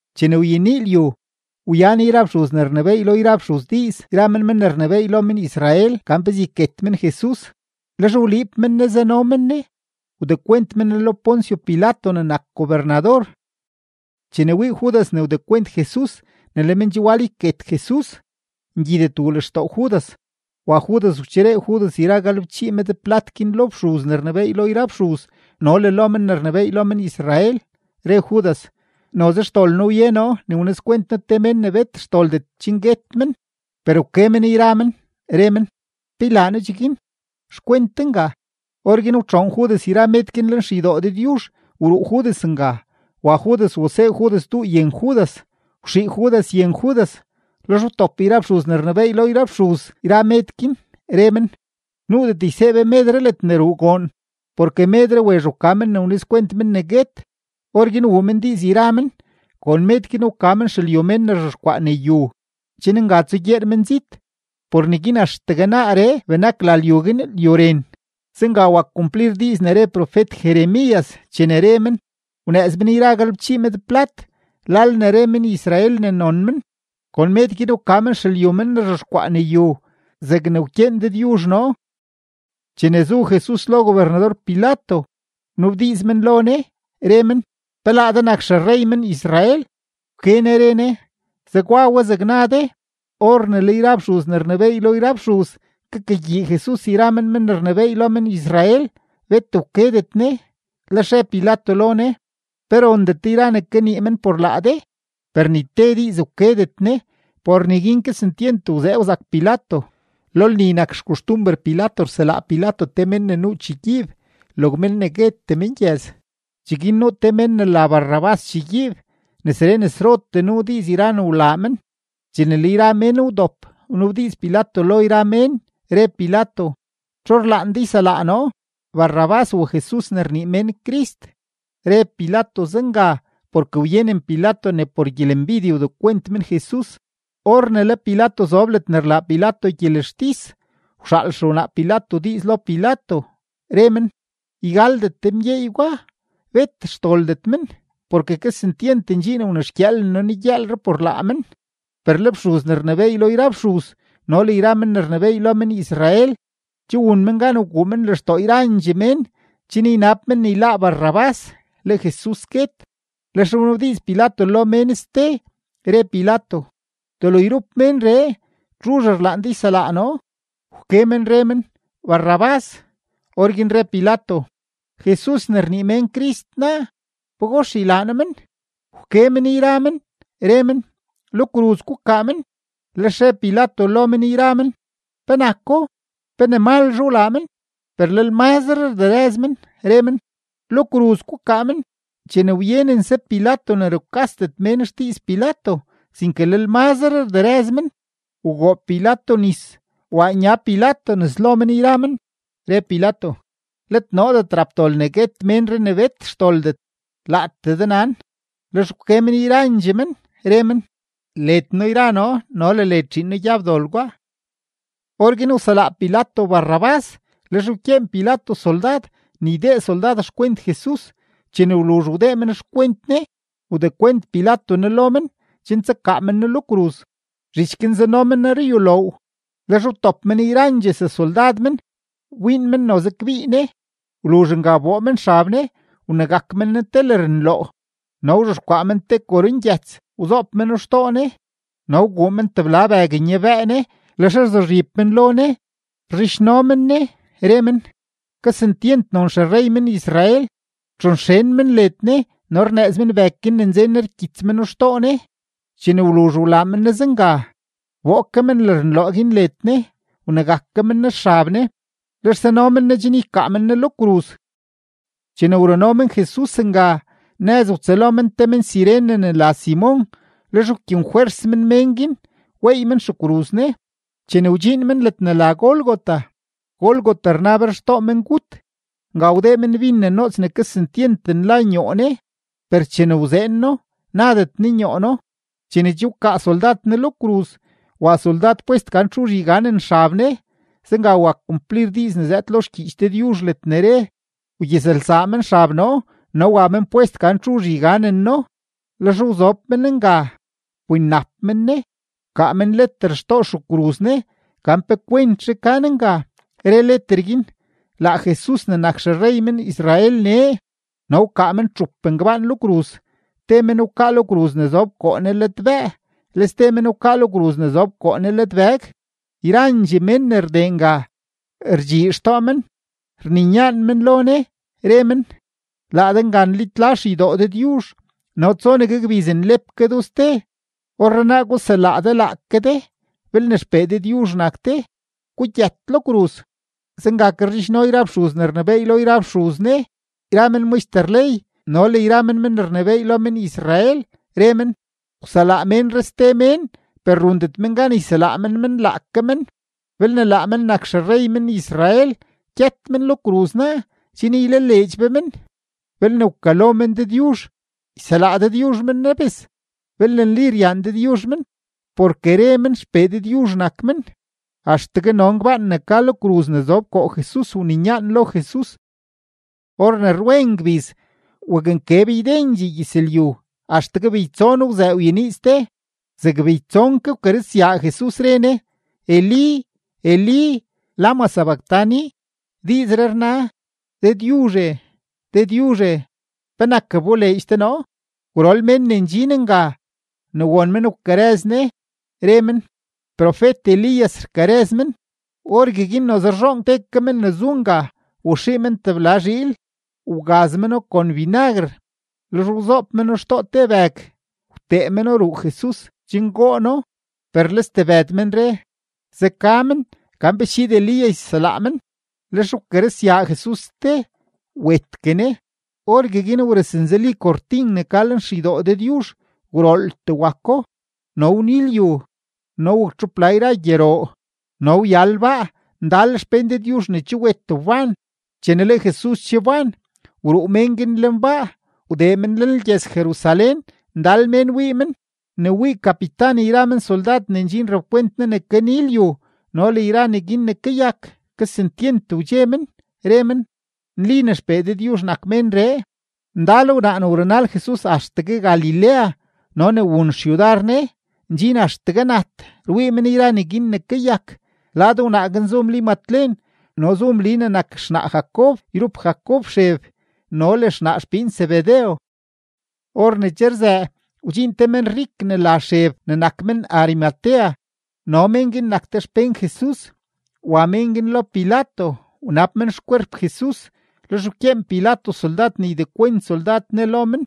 Chene wyenii lyu, wyan yra fxuz ne rnebééy lo yra fxuz diiz yra men men ne rnebééy lo men-Israel gan pezee yket men Jesus. Lex wliib men Ne zano men Ne, wdekwent men Ne lo Poncio Pilato ne nak gobernador. Chene wii Judas ne wdekwent Jesus, ne le men che wal yket Jesus, ngyidet wuu lextoo Judas, wa Judas wacheree Judas yra galebchii med plat guin lo fxuz ne rnebééy lo yra fxuz no le lo men ne rnebééy lo men-Israel, re Judas: ―Noze xdol noo wye noo ne wnizkwent noo te mén ne bet xdoldet chen guet men. Per wke men yra men, re men: ―¿Pe ylaa noo cheguin? ¡Xkwent de nga! Orguin wtxoon Judas yra med guin lenxeydoo Dëdyuzh, wruu Judas nga. Wa Judas wasee Judas duu yen Judas, wxii Judas yen Judas. Lex wtop yra fxuz ne rnebééy lo yra fxuz yra med guin, re men: ―Nuudet ysee be medree ledne ruu goon porke medree wezh wka men ne wnizkwent men ne guet. Orguin wuu men diiz yra men, kon med guin wka men xelyu mén ne rzhexkwaa ne yu, chen nga tsugyeer menzit. Por neguin axtegue naaree benak la lyu guin Lyu Ren. Zenga wak kumplir diiz ne re profet-Jeremías chene re men: “Wnëëz men yra galebchii med plat, lal ne re men-Israel ne non men, kon med guin wka men xelyu men ne rzhexkwaa ne yu zegne wkyeen Dëdyuzh noo.” Chene zu Jesus lo gobernador-Pilato, wnabdiiz men lo Ne, re men: ―¿Pe laa de nak xerrey men-Israel? Wke Ne re Ne: ―Zegwa we zeg na de. Or ne le yra fxuz ne rnebééy lo yra fxuz kakagyii Jesus yra men men ne rnebééy lo men-Israel, bet wkedet Ne. Lex re Pilato lo Ne: ―¿Pe rondet de yra ne kanii men por laa de? Per ni te diiz wkedet Ne. Por neguin kesentyent wzee wzak Pilato. Lo lni nak xkoxtumber Pilato rselaa Pilato te mén ne nuu chegyiib, log mén ne guetee mengyëz. Cheguin nuu te men ne la Barrabás chegyiib; nesree nesrotee nuu diiz yra ne wlaa men. Chene le yra mén wdop, wnabdiiz Pilato lo yra mén, re Pilato: ―¿Txu rlaan de yselaa noo, Barrabás u Jesus ne rnii mén Crist? Re Pilato zenga porke wyenen Pilato ne por gyelembidye wdekwent men Jesus. Or ne le Pilato zob ledne rlaa Pilato gyelextis, wxaal xewnaa Pilato diiz lo Pilato, re men: “Ygaldet de mgyeey gwa, bet xdoldet men. Porke kesentyent ndxiin wnexgyëëlen noo negyëëlree por laa men.” Per le fxuz ne rnebééy lo yra fxuz no le yra men ne rnebééy lo men-Israel che wun men gan wguu men lextoo yrandxee mén chen ynab men ne yláá Barrabás, le Jesus guet. Lex wnabdiiz Pilato lo yra mén ste, re Pilato: ―¿Delo yrup ménree, txuzh rlaan de yselaa noo? Wke men re men: ―¡Barrabás! Orguin re Pilato: ―¿Jesus ne rnii mén Crist naa, pagox ylaa noo men? Wke men yra men, re men: ―¡Lo kruz gukaa men! Lex re Pilato lo men yra men: ―¿Penako? ¿Pe ne malzhe wlaa men? Per lel mazre rderëz men, re men: ―¡Lo kruz gukaa men! Chene wyenense Pilato ne rukasdet mén xdiiz Pilato, sinke lel mazre rderëz men, wgoob Pilato nis, waa nya Pilato nes lo men yra men, lex re Pilato: ―Let noodet rap dol ne guet ménree ne bet xdoldet; laatee de nan. Lex wke men yrandxee men, re men: ―Led noo yra noo no le led zhiin noo gyab dol gwa. Orguin wselaa Pilato Barrabás; lex wkyeen Pilato soldad ne ydee soldad xkwent Jesus; chene wluzh wdee men xkwent Ne, wdekwent Pilato Ne lo men chen tsakaa men Ne lo kruz. Zhich guin zano men Ne ruyuloow; lex wtop men yrandxee sesoldad men wbiin men noze kbii Ne. Wluzh nga wboo men xab Ne, wnegak men Ne te lërnloo, no wzhexkwaa men te korongyëts wzoob meno xtoo Ne, no wguu men tebla bëg nyabëë Ne. Lex rzuzhib men lo Ne, rzhidxno men Ne, re men: ―¡Kesentyent non xerrey men-Israel! Rtxonxen men led Ne no rnëëz men bëg guin ne nzen Ne rkyits meno xtoo Ne. Chene wluzh wlaa men Ne zenga, wboo ke men lërnloo guin led Ne, wnegak ke men Ne xab Ne, lex zano men Ne chen ykaa men Ne lo kruz. Chene wruno men Jesus nga, nëz wtsëlo men te men-Cirene ne la Simon, lex wkyenfwers men mén guin weey men xekruz Ne. Chene wdxiin men ledne la Gólgota (Gólgota rna, Berxtoo Mengut.), nga wdee men bin ne noots ne kesentyent nla nyoo Ne; per chene wzeen No, nadet Ne nyoo No. Chene che wkaa soldad Ne lo kruz, wa soldad pwest gan txuzh yganen xab Ne. Zenga wak kumplir diiz ne zëëd lo xgyiich Dëdyuzh ledne re: “Wgyizlsaa men xab noo no wa men pwest gan txu yganeno.” Lex wzob men nga, wbinnap men Ne. Wkaa men leter xtoo xekruz Ne gan pe kwentzhe ka Ne nga, re leter guin: “Laa Jesus ne nak xerrey men-Israel nee.” No wkaa men txup ngbaan lo kruz, te men wkaa lo kruz ne zob koo Ne ladbëë, le ste men wkaa lo kruz ne zob koo Ne ladbëg. Yrandxee mén ne rdee nga, rdxii xtoo men, rninyaan men lo Ne, re men: ―Laa de nga nlitla xeydoo Dëdyuzh no tsonegue gbiz nlep ke do ste, orrenaa guselaa de laake de. Belne XPee Dëdyuzh nak de, gugyët lo kruz. Zenga ke rzhidxno yra fxuz ne rnebééy lo yra fxuz Ne yra men maxter ley no le yra men men ne rnebééy lo men-Israel, re men: ―Wselaa ménree ste mén, per rundet men gan yselaa men men laake men. Belne laa men nak xerrey men-Israel, gyët men lo kruz naa chen ylaleedx be men. Belne wkalo men Dëdyuzh, yselaa Dëdyuzh men nabes belne nli ryaan Dëdyuzh men; porke re men XPee Dëdyuzh nak men. Axtegue no ngbaan ne ka lo kruz ne zob koo Jesus wninyaan lo Jesus. Or ne rwen ngbiz, waknkeb ydendxee gyëzlyu, axtegue beytson wzëë wyenii ste. Zeg beytson ke wkarëzyaa Jesus, re Ne: ―Elí, Elí, ¿lama sabactani? ―Diizree rna: Dëdyuzhe, Dëdyuzhe, ¿penak wboleedx de noo? Gwrol men ne ndxin nga, ne won men wkarëz Ne, re men: ―Profet-Elías rkarëz men. Orgueguin noze rzhoon te ke men ne zu nga, waxii men tebla zhiil, wgaz meno kon binaguer; lex wzoob meno xtoo te bëg, wtee meno ruu Jesus chen goo Ne binaguer. Per le stebëd men re: ―Zeka men, gan pe schiid Elías yselaa men. Lex wkarëzyaa Jesus ste, wetgue Ne. Orgueguin wrëznzeli kortin ne ka lenxeydoo Dëdyuzh, gwrooltee wako, no wni lyu, no waktxupla yra gyeroo, no wyal baa; ndal xpén Dëdyuzh ne che wet wban. Chene le Jesus che wban, wruu mén guin lenbaa, wdee men lenlgyëz-Jerusalén, ndal mén wii men. Ne wii kapitan yra men soldad ne ndxin rapkwent Ne ne kani lyu no le yra neguin ne kayak, kesentyent wdxe men, re men: ―Nli ne XPee Dëdyuzh nak ménree. Ndal wnaa ne wrunal Jesus axtegue Galilea no ne wun xyudar Ne, ndxin axtegue nat rwii men yra neguin ne kayak. Lad wnaa guin zu Mli Matlen no zu Mli ne nak xnaa Jacob yrup Jacob Xeb no le xnaa xpiin Zebedew. Or ne che rzëë, wdxiin te menrik ne la Xeb ne nak men-Arimatea no mén guin nak te xpén Jesus. Wa mén guin lo Pilato wnab men xkwerp Jesus. Lex wkyeen Pilato soldad ne ydekwent soldad Ne lo men.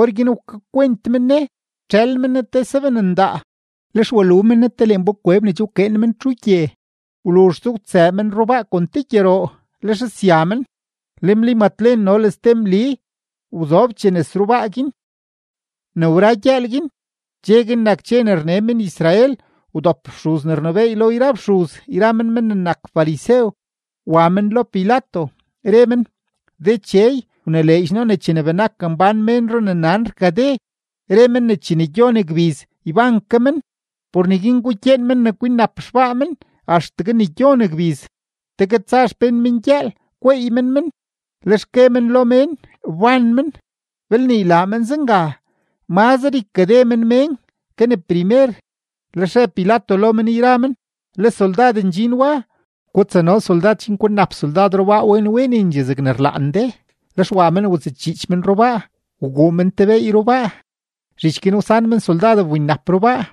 Orguin wkakwent men Ne, wtxël men Ne te saben ndaa. Lex walu men Ne te lenbakweb ne che wkeen men txugye. Wluzhse wtsëë men rubaa kon te gyeroo, lex sya men. Le Mli Matlen no le ste Mli wzobchee nes rubaa guin. Ne wra gyëël guin, dxe guin nak dxe ne rne men-Israel, wdop fxuz ne rnebééy lo yra fxuz yra men men ne nak farisew, wa men lo Pilato, re men: ―Dechey, wnileedx noo ne chene benak mbán ménro ne nan rkade, re men ne chene gyon gbiz, yban ke men. Por neguin gukyeen men ne kwinnap xbaa men axtegue ne gyon gbiz, tegue tsa xpén men gyëël gweey men men, lex gue men lo mén: “Wban men.” Belne ylaa men zenga, mazre ykade men mén ke ne primer. Lex re Pilato lo men yra men: ―Le soldad ndxin wa; gutsano soldad chen kwinnap soldad rubaa wen wenendxee zegne rlaan de. Lex wa men watsëchiich men rubaa, wguu men te beey rubaa. Zhich guin wsan men soldad wbinnap rubaa.